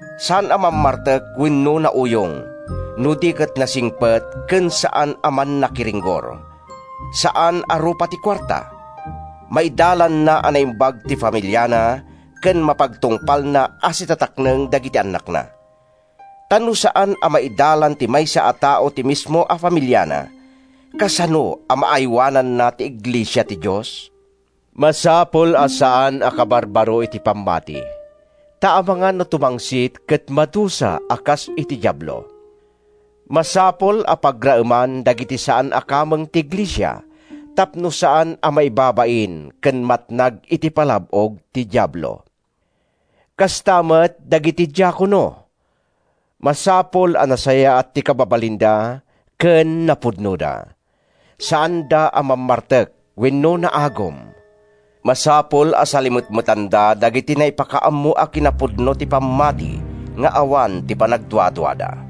Saan a mammartek wenno nauyong, no di ket nasingpet ken saan a mannakiringgor. Saan a rupa ti kuarta. Maidalanna a naimbag ti familiana ken mapagtungpalna a sitatakneng dagiti annakna. Ta no saan a maidalan ti maysa a tao ti mismo a familiana, kasano a maaywananna ti iglesia ti Dios? Masapul a saan a kabarbaro iti pammati, ta amangan no tumangsit ket madusa a kas iti Diablo. Masapul a pagraeman dagiti saan a kameng ti iglesia tapno saan a maibabain ken matnag iti palab-og ti Diablo. Kasta met dagiti diakono: Masapul a nasayaat ti kababalinda ken napudnoda. Saanda a mammartek wenno naagum. Masapul a salimetmetanda dagiti naipakaammo a kinapudno ti pammati nga awan ti panagduaduada.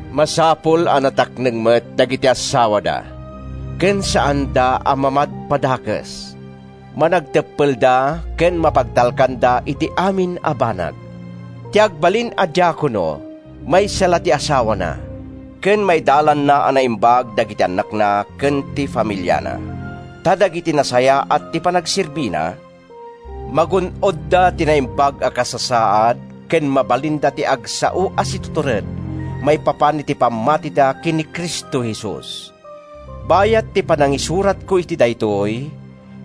Masapul a natakneng met dagiti assawada, ken saanda a mamadpadakes. Managteppelda ken mapagtalkanda iti amin a banag. Ti agbalin a diakono, maysa la ti asawana, ken maidalanna a naimbag dagiti annakna ken ti familiana. Ta dagiti nasayaat ti panagserbina, magun-odda ti naimbag a kasasaad ken mabalinda ti agsao a situtured maipapan iti pammatida ken ni Cristo Jesus. Bayat ti panangisuratko iti daytoy,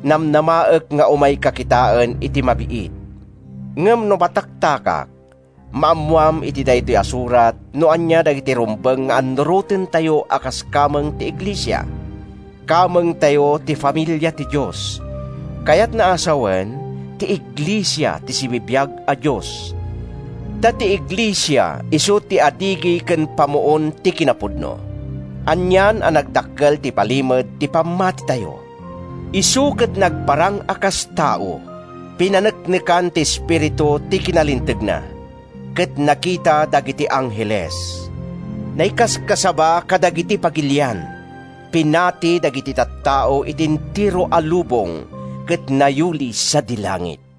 namnamaek nga umayka kitaen iti mabiit. Ngem no mataktakak, maammoam iti daytoy a surat no ania dagiti rumbeng nga annurotentayo a kas kameng ti iglesia. Kamengtayo ti familia ti Dios, kayatna a sawen, ti iglesia ti sibibiag a Dios. Ta ti iglesia isu ti adigi ken pamuon ti kinapudno. Anian a nagdakkel ti palimed ti pammatitayo: Isu ket nagparang a kas tao, Pinaneknekan ti Espiritu ti kinalintegna, Ket nakita dagiti angheles. Naikaskasaba kadagiti pagilian, Pinati dagiti tattao iti entero a lubong, Ket nayuli sadi langit.